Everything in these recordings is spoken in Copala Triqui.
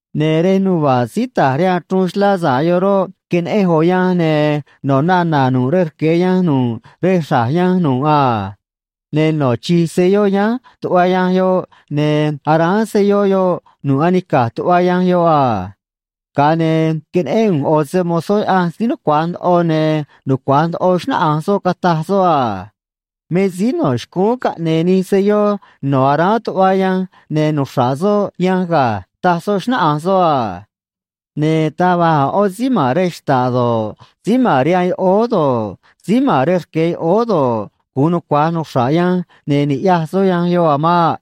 Ne̱ rej nuva̱ꞌ síí ta̱j rihaan chruun xlá sa̱ꞌ yoꞌ roꞌ, queneꞌenj ꞌo̱ yanj, ne̱ no̱ nana̱ nu̱ꞌ rej rque̱ yanj nu̱ꞌ rej xra̱j yanj nu̱ꞌ a. Ne̱ no̱ chi̱j selló yánj tuꞌva yanj yoꞌ, ne̱ aráán selló yoꞌ nu̱ꞌ anica̱j tuꞌva yanj yoꞌ a. Ga̱a ne̱ queneꞌén ꞌu̱nj ꞌo̱ se‑mo̱zó Yaꞌanj síí nucua̱j ndoꞌo, ne̱ nucua̱j ndoꞌo xnáꞌanj soꞌ, cataj soꞌ a: ―Me síí no̱ xcúún caꞌne̱e̱ nij selló no̱ aráán tuꞌva yanj ne̱ nuxra̱ꞌ soꞌ yanj ga̱ ―taj soꞌ, xnáꞌanj soꞌ a. Ne̱ taj va̱j a̱ ꞌó síí ma̱n rej xta̱ꞌ do̱ꞌ, síí ma̱n rihaan yoꞌóó do̱ꞌ, síí ma̱n rej rque̱ yoꞌóó do̱ꞌ, gu̱un nucua̱j nuxra̱ꞌ yanj ne̱ ni̱ꞌyaj soꞌ yanj yoꞌ a̱ maꞌ.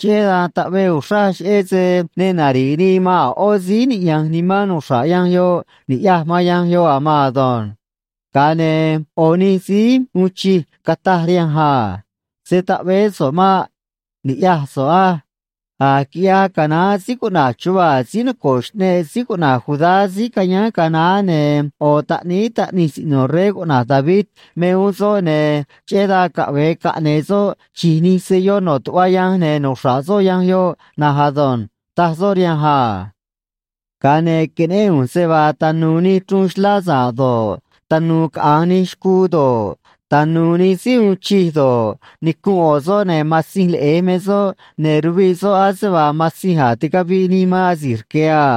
Cheꞌé dan taꞌvee uxraj cheꞌé se ne nari̱ꞌ nii man a̱ ꞌó síí niꞌya̱nj nimán nuxra̱ꞌ yanj yoꞌ ni̱ꞌyaj man yanj yoꞌ a̱ maan ado̱nj. Ga̱a ne̱ ꞌo̱ nij síí uun chij cataj rihanj a: ―Se̱ taꞌveé so̱ꞌ maꞌ. Ni̱ꞌyaj so̱ꞌ á. A̱j quiꞌyaj canaán síí cuꞌna̱j Chuvaa̱ síí noco̱ꞌ xꞌneꞌ síí cuꞌna̱j Judá síí cayáán ga̱a naá, ne̱ ꞌo̱ taꞌníí taꞌnij siꞌno̱ rey cuꞌna̱j David me uún soꞌ, ne̱ cheꞌé dan caꞌve̱e caꞌne̱e̱ soꞌ chi̱j nij selló no̱ tuꞌva yanj ne̱ nuxra̱ꞌ soꞌ yanj yoꞌ na̱nj ado̱nj ―taj soꞌ rihanj a. Ga̱a ne̱ queneꞌén ꞌu̱nj se vaa tanu̱u̱ nij chruun xlá sa̱ꞌ do̱ꞌ, tanu̱u̱ caꞌa̱nj nij xcuu do̱ꞌ, tanu̱u̱ nij síí uun chij do̱ꞌ, nicunꞌ ꞌo̱ soꞌ, ne̱ Matzinj Leꞌe̱j me soꞌ, ne̱ ruviꞌ soꞌ ase vaa matzinj a̱j ticaviꞌ nii man asi̱j rque̱ a.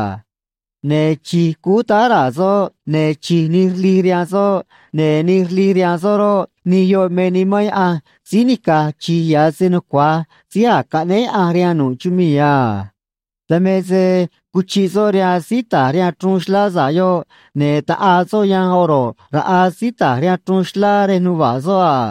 Ne̱ chi̱j cúú ta̱j raa̱ soꞌ, ne̱ chi̱j nij rlij rihaan soꞌ, ne̱ nij rlij rihaan soꞌ roꞌ, nij yoꞌ me Nimán Yaꞌanj síí nica̱j chi̱j ya̱ se nucua̱j síí a̱j caꞌnéé Yaꞌanj rihaan nu̱ꞌ chumii̱ a. Dan me se cuchiꞌ soꞌ rihaan síí ta̱j rihaan chruun xlá sa̱ꞌ yoꞌ, ne̱ taꞌaa soꞌ yanj oro̱ꞌ raꞌa síí ta̱j rihaan chruun xlá rej nuva̱ꞌ soꞌ a.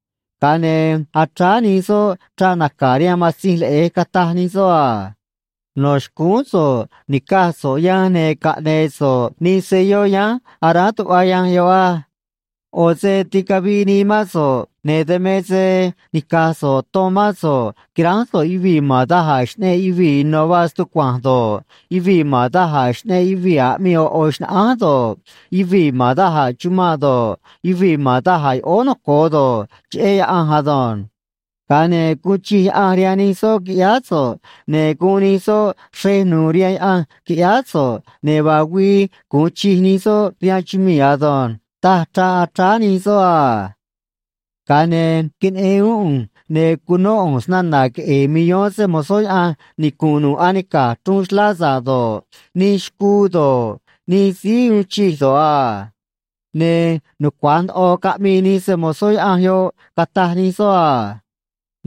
Ga̱a ne̱ achráá nij soꞌ chraꞌ naca̱ rihaan Matzinj Leꞌe̱j, cataj nij soꞌ a: No̱ xcúún so̱ꞌ ni̱caj so̱ꞌ yanj ne̱ caꞌne̱e̱ so̱ꞌ nij selló yánj aráán tuꞌva yanj yoꞌ á. ꞌO̱ se ticaviꞌ nii mán so̱ꞌ, ne̱ dan me se nica̱j so̱ꞌ ton mán so̱ꞌ quiránj so̱ꞌ yuvii̱ ma̱n da̱j a̱ xꞌneꞌ yuvii̱ ino̱ vaa stucua̱nj do̱ꞌ, yuvii̱ ma̱n da̱j a̱ xꞌneꞌ yuvii̱ aꞌmii ꞌo̱ ꞌo̱ xnaꞌánj do̱ꞌ, yuvii̱ ma̱n da̱j a̱ chumanꞌ do̱ꞌ, yuvii̱ ma̱n da̱j a̱ yoꞌóó noco̱o do̱ꞌ, cheꞌé Yaꞌanj ado̱nj. Ga̱a ne̱ guun chij Yaꞌanj rihaan nij soꞌ, quiꞌyáá so̱ꞌ, ne̱ guun nij soꞌ xrej nu̱u̱ rihaan Yaꞌanj, quiꞌyáá so̱ꞌ, ne̱ vaa güii gu̱un chij nij soꞌ rihaan chumii̱ ado̱nj, taj chraꞌ achráá nij soꞌ a. Ga̱a ne̱ queneꞌen uún ꞌu̱nj, ne̱ cunó ꞌu̱nj snana̱ queꞌe̱e̱ millón se‑mo̱zó Yaꞌanj nicu̱nꞌ nu̱ꞌ anica̱j chruun xlá sa̱ꞌ do̱ꞌ, nij xcuu do̱ꞌ, nij síí uun chij do̱ꞌ a. Ne̱ nucua̱j ndoꞌo caꞌmii nij se‑mo̱zó Yaꞌanj yoꞌ, cataj nij soꞌ a: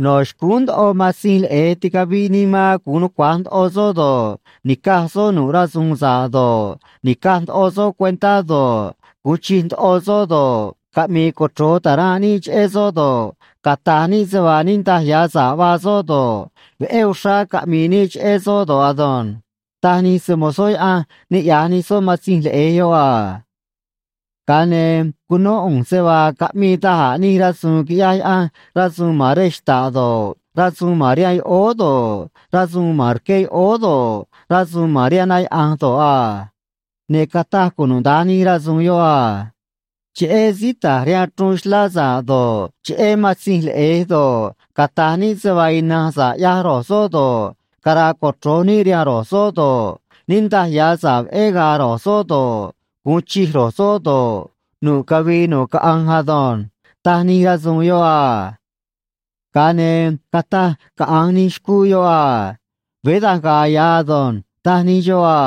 No̱ xcúún ndoꞌo Matzinj Leꞌe̱j ticaviꞌ nii man gu̱un nucua̱j ndoꞌo soꞌ do̱ꞌ, ni̱caj soꞌ nu̱ꞌ rasu̱u̱n sa̱ꞌ do̱ꞌ, ni̱caj ndoꞌo soꞌ cuentá do̱ꞌ, gu̱un chij ndoꞌo soꞌ do̱ꞌ, caꞌmi̱i̱ cochro̱j ta̱ranꞌ níꞌ cheꞌé soꞌ do̱ꞌ, cata̱j níꞌ se vaa niꞌndaj ya̱ sa̱ꞌ vaa soꞌ do̱ꞌ, veꞌé uxrá caꞌmi̱i̱ níꞌ cheꞌé soꞌ do̱ꞌ ado̱nj taj nij se‑mo̱zó Yaꞌanj niꞌya̱j nij soꞌ Matzinj Leꞌe̱j yoꞌ a. Ga̱a ne̱ cunó ꞌu̱nj se vaa caꞌmii da̱j a̱ nij rasu̱u̱n quiꞌyaj Yaꞌanj, rasu̱u̱n ma̱n rej xta̱ꞌ do̱ꞌ, rasu̱u̱n ma̱n rihaan yoꞌóó do̱ꞌ, rasu̱u̱n ma̱n rque yoꞌóó do̱ꞌ, rasu̱u̱n ma̱n rihaan na yaꞌa̱nj do̱ꞌ a. Ne̱ cataj cunuda̱nj nij rasu̱u̱n yoꞌ a: Cheꞌé síí ta̱j rihaan chruun xlá sa̱ꞌ do̱ꞌ, cheꞌé Matzinj Leꞌe̱j do̱ꞌ, cata̱j níꞌ se vaa ina̱nj sa̱ꞌ ꞌyaj ro̱j soꞌ do̱ꞌ, cara̱a̱ cochro̱j níꞌ rihaan ro̱j soꞌ do̱ꞌ, niꞌndaj ya̱ sa̱ꞌ veꞌé ga̱a̱ ro̱j soꞌ do̱ꞌ, gu̱un chij ro̱j soꞌ do̱ꞌ, nu̱ꞌ cavii nu̱ꞌ caꞌanj ado̱nj taj nij rasu̱u̱n yoꞌ a. Ga̱a ne̱ cataj caꞌa̱nj nij xcuu yoꞌ a: ―Veé da̱nj ga̱a̱ ya̱ ado̱nj ―taj nij xoꞌ a.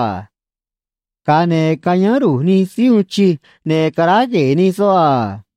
Ga̱a ne̱ cayáán ru̱j nij síí uun chij, ne̱ caráj gue̱e̱ nij soꞌ a.